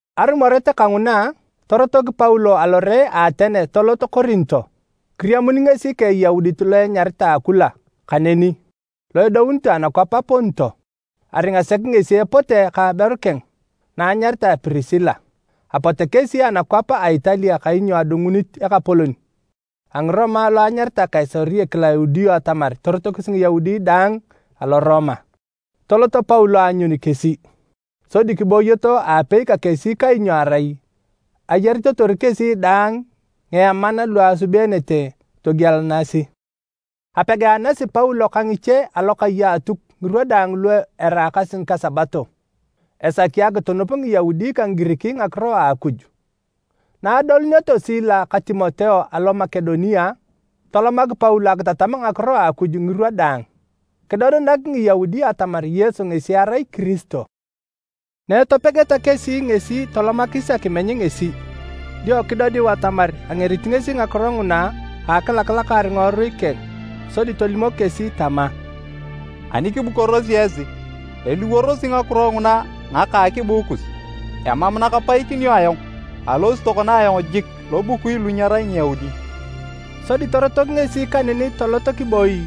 Arumoret kanguna, torotok Paulo alore a Atene tolot Korinto. Kiriamun ngesi ka Eyaudit lo enyaritae Akula kaneni lo edounitoe anakwap a Ponto. Aringa sek ngesi epote ka aberu keng na anyaritae Prisila, apote kesi anakwap a Italia kainyo adungunit ekapolon a Ngiroma lo enyaritae Kaisari Kilaudio atamar torotokis Ngiyaudi daang alo Roma. Tolot Paulo aanyun kesi, sodi kibooyoto aapei ka kesi kainyo arai ayaritotor kesi daang ngieman lu asubeenete togielanasi. Apegaanasi Paulo ka ngiche alokai a Atuk ngirwa daang lu eraakasi ngika Sabato, esaki akitunup Ngiyaudi ka Ngigirik ngakiro a Akuj. Na adolunioto Sila ka Timoteo alo Makedonia, tolomak Paulo akitatam ngakiro a Akuj ngirwa daang. Kidodenak Ngiyaudi atamar Yesu ngesi erai Kiristo. Na etopegeta kesi ngesi tolomakis akimeny ngesi, dio kidodiu atamar angerit ngakiro nguna a akilakalakaar ngiworui keng sodi tolimok kesi tama, “Ani kibukorosi esi, eliworosi ngakiro nguna ngaka a akibuu kus! Emam na kapaikinio ayong. Alosi tokona ayong jik lobukui lu nyerai Ngiyaudi.” Sodi torotok ngesi kaneni tolot kiboi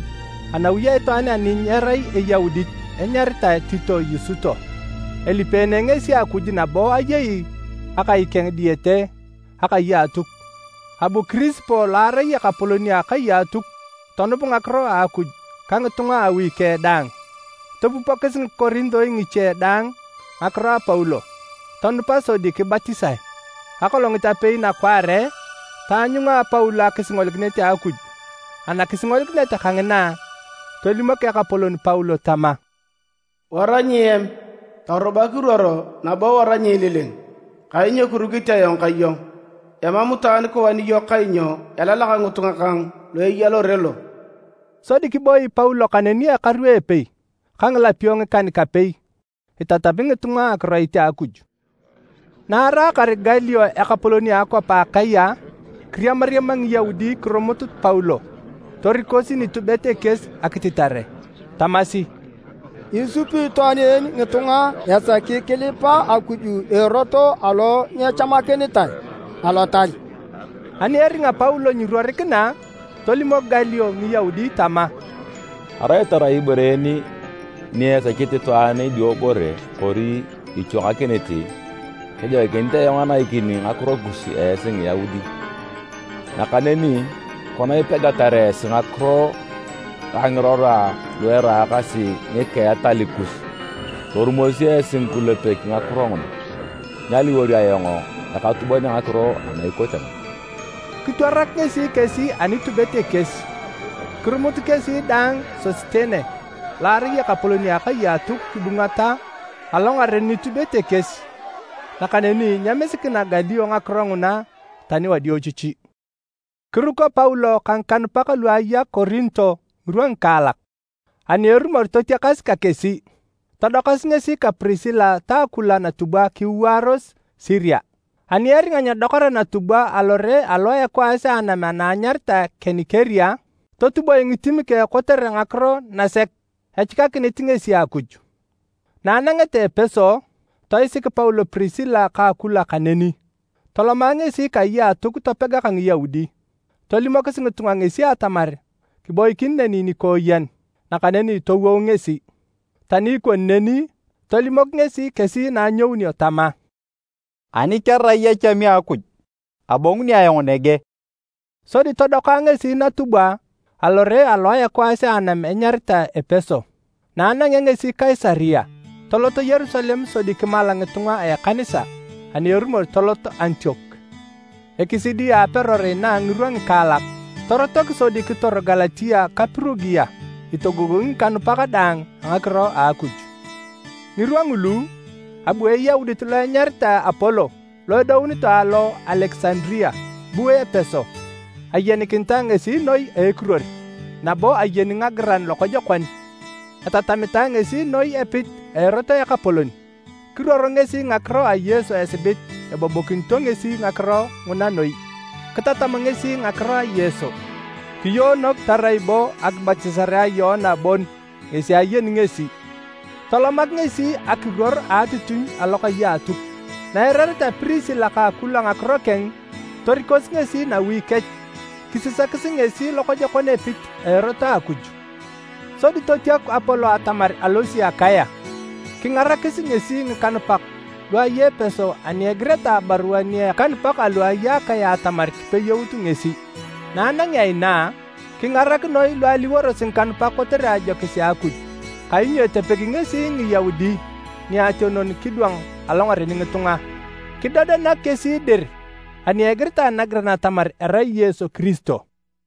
anawi a itwaan ani nyerai Eyaudit enyaritae Tito Yusuto. Elipeene ngesi Akuj nabo ayei akai keng diyete akai a Atuk. Abu Kirispo lo arai ekapolon a akai a Atuk tonup ngakiro a Akuj ka ngitunga a awi keng daang. Topupokis Ngikorintoi ngiche dang ngakiro a Paulo, tonupa sodi kibatisae. Akolongit apei nakwaare, taanyunga Paulo akisingolikinet a Akuj. Anakisingolikinet kangina, tolimok Ekapolon Paulo tama, “Wara nyiem, torubak iruoro nabo wara nyiililing, kainyo kirukit ayong ka iyong. Emam itwaan kiwani iyong kainyo elalak ngitunga kang lu eya lore lo.” Sodi kiboi Paulo kaneni ekaru epei ka ngilapio ngikan-kapei, itatami ngitunga akiroit a Akuj. Na araakar Galio ekapolon a akwap a Akaya, kiriamariama Ngiyaudi kirumut Paulo torikosi nitubet ekies akititare. Tamasi, “Isupi itwaan en ngitunga esaki kilipa Akuj a erot alo nyechamakinitae Alotal!” Ani eringa Paulo nyiruorikina, tolimok Galio Ngiyaudi tama, “Arai tarai ibore en ni esechit itwaan idiobore kori ichwangakinit, kejoikinit ayong anaikini ngakiro nakus esi Ngiyaudi. Nakaneni kona ipegatar esi ngakiro ka ngirora lu eraakasi ngika a etal kus, torumosi esi ngikulepek ngakiro nguna. Nyaliwor ayong ekatubon a ngakiro ana ikote nguna!” Kitwarak ngesi kesi a nitubet ekies. Kirumut kesi daang Sositene lo arai ekapolon a akai a Atuk kibungata alongaren nitubet ekies. Nakaneni nyemisikina Galio ngakiro nguna tani wadiochichi. Kiruko Paulo ka ngikanupak lu aya Korinto ngirwa ngikaalak. Ani erumor totiakas ka kesi, todokasi ngesi ka Prisila ta Akula natubwa kiwaaros Siria. Ani eringa nyedokara natubwa alore alo a ekwaas a anam ana anyaritae Kenikirea, totuboe ngitim keng kotere ngakiro nasek echikakinit ngesi Akuj. Na anangeta Epeso, toisik Paulo Prisila ka Akula kaneni. Toloma ngesi kai a Atuk topega ka Ngiyaudi. Tolimokis ngitunga ngesi atamar kiboikin neni nikooyen nakaneni towou ngesi. Tani ikoni neni, tolimok ngesi kesi na anyounio tama, “Ani kerai echami a Akuj, abonguni ayong nege.” Sodi todoka ngesi natubwa alore alo a ekwaas a anam enyaritae Epeso. Na anangea ngesi Kaisaria, tolot Yerusalem sodi kimala ngitunga a ekanisa ani erumor tolot Antiok. Ekisidi a aperor inaa ngirwa ngikaalak, torotok sodi kitor Galatia ka Pirugia itogogongi ngikanupak daang a ngakiro a Akuj. Ngirwa ngulu, abu Eyaudit lo enyaritae Apolo lo edounitoe alo Alekisandaria, bu Epeso. Ayenikinitae ngesi noi a ekiruor, nabo ayeni ngagiran lokojokon. Etatamitae ngesi noi epit a Erot a Ekapolon. Kiruor ngesi ngakiro a Yesu esibit ebobokinito ngesi ngakiro nguna noi. Kitatam ngesi ngakiro a Yesu kiyoonok tarai bo akibatisare a Yoana bon ngesi ayeni ngesi. Tolomak ngesi akiruor a atitinyu alokai a Atuk. Naeirareta Prisila ka Akula ngakiro keng, torikosi ngesi nawi kech kisisakis ngesi lokojokon epit a Erot a Akuj. Sodi totiaku Apolo atamar alosi Akaya, kingarakis ngesi ngikanupak lu aya Epeso ani egireta abarua nia ngikanupak alu aya Akaya atamar kipeyout ngesi. Na anangea inaa, kingarak noi lu aliworosi ngikanupak kotere ajokis a Akuj. Kainyo etepegi ngesi Ngiyaudi niationon kidwang alongaren ngitunga. Kidodenak kesi dir ani egiritae nagiran atamar erai Yesu Kiristo.